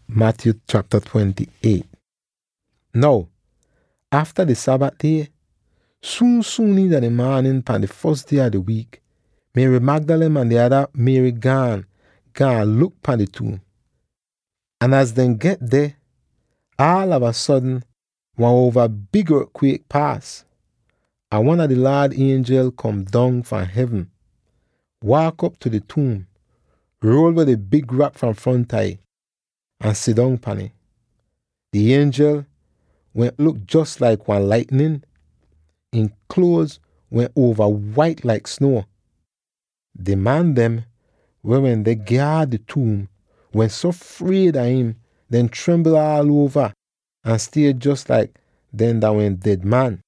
Jesus deh liv agen! Now, afta di Sabat die, suun-suun iina di maanin pan di fos die a di wiik, Mary Magdalene ahn di ada Mary gaan, gaan luk pahn di tuum. Ahn az dehn get deh, aalava sodn wan uova big ort-kwiek paas, ahn wan a di Laad ienjel kom don fahn hevn, waak op tu di tuum, ruol weh di big rak fahn fronta ih, ahn sidong pahn ih! Di ienjel wehn luk jos laik wan laitnin; ihn kluoz wehn uova wait laik snuo. Di man dem weh wende gyaad di tuum wehn so fried a im dehn trimbl aal uova ahn stie jos laik dehn dah wehn ded man.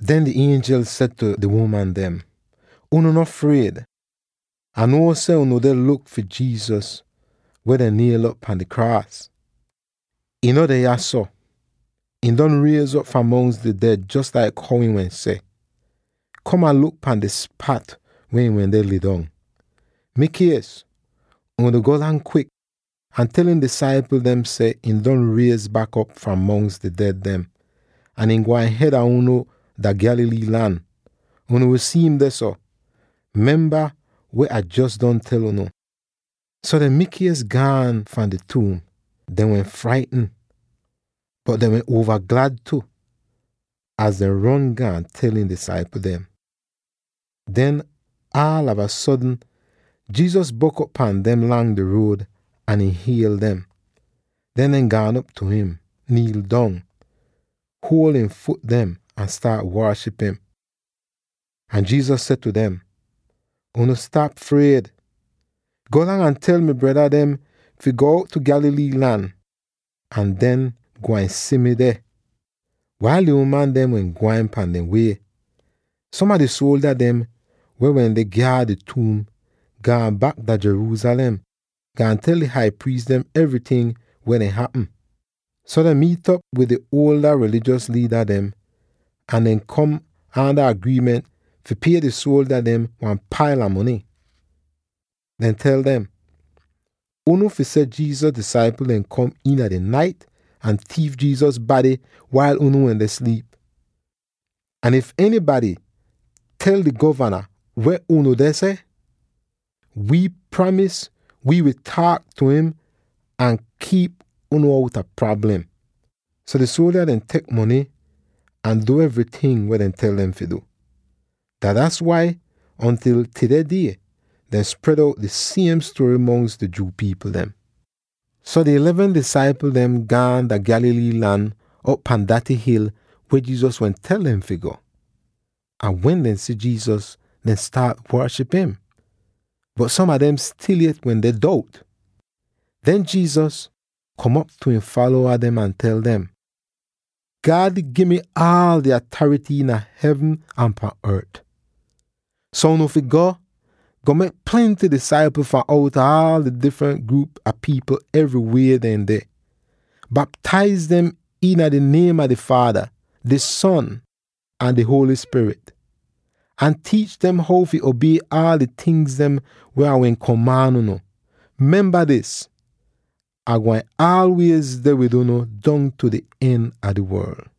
Den di ienjel seh tu di uman dem, “Unu no fried! Ah nuo seh unu deh luk fi Jesus weh dehn niel'op pahn di kraas. Ihn no deh yahso; ihn don riez'op fahn mongs di ded jos laik how ihn wehn seh. Kom ahn luk pahn di spat weh ihn wende lidong. Mikies, unu golang kwik ahn tel ihn disaipl dem seh ihn don riez bak op fahn mongs di ded dem, ahn ihn gwain hed a unu dah Galilee lan; unu wi si'im dehso. Memba weh Ah jos don tel unu.” So dehn mikies gaan fahn di tuum; dehn wehn fraitn, bot dehn wehn uova glad tu, az dehn ron gaan tel ihn disaipl dem. Den, aalava sodn Jesus bok'op pahn dem lang di ruod ahn ihn hiel dem. Den dehn gaan op tu im, niil dong, huol ihn fut dem ahn staat waaship im. Ahn Jesus seh tu dem, “Unu stap fried! Golang ahn tel mi breda dem fi go out tu Galilee lan, ahn dehn gwain si mi deh.” Wail di uman dehn wehn gwain pahn dehn wie, som a di suoldya dem weh wende gyaad di tuum gaan bak dah Jerusalem, gaan tel di hai priis dem evryting weh wehn hapm. So dehn miit'op wid di Jewish rilijos liida dem ahn dehn kom aanda agriiment fi pie di suoldya dem wan paila mony. Dehn tel dem, “Unu fi seh Jesus disaipl dem kom iina di nait ahn tiif Jesus bady wail unu wende sliip. Ahn if enybady tel di govana weh unu deh seh, wii pramis wii wi taak tu im ahn kiip unu outa prablem.” So di suoldya dem tek di mony ahn du evryting weh dehn tel dem fi du. Dah das wai ontil tudeh die dehn spred out dis siem stuory mongs di Jew pipl dem. So di eleven disaipl gaan dah Galilee lan op pahn daty hil weh Jesus wehn tel dem fi go. Ahn wen dehn si Jesus, dehn staat waaship im, bot som a dem stil yet wende dout. Den Jesus kom op tu ihn falowa dem ahn tel dem, “God gi mi aal di atarity iina hevn ahn pahn ort; so unu fi go, go mek plenty disaipl fahn outa aal di difrent gruup a pipl evry weh dehn deh. Baptaiz dem iina di niem a di Faada, di Son, ahn di Holy Spirit, ahn tiich dem how fi obie aal di tingz weh Ah wehn komaan unu. Memba dis: Ai gwain aalwiez deh wid unu dongtu di en a di worl!”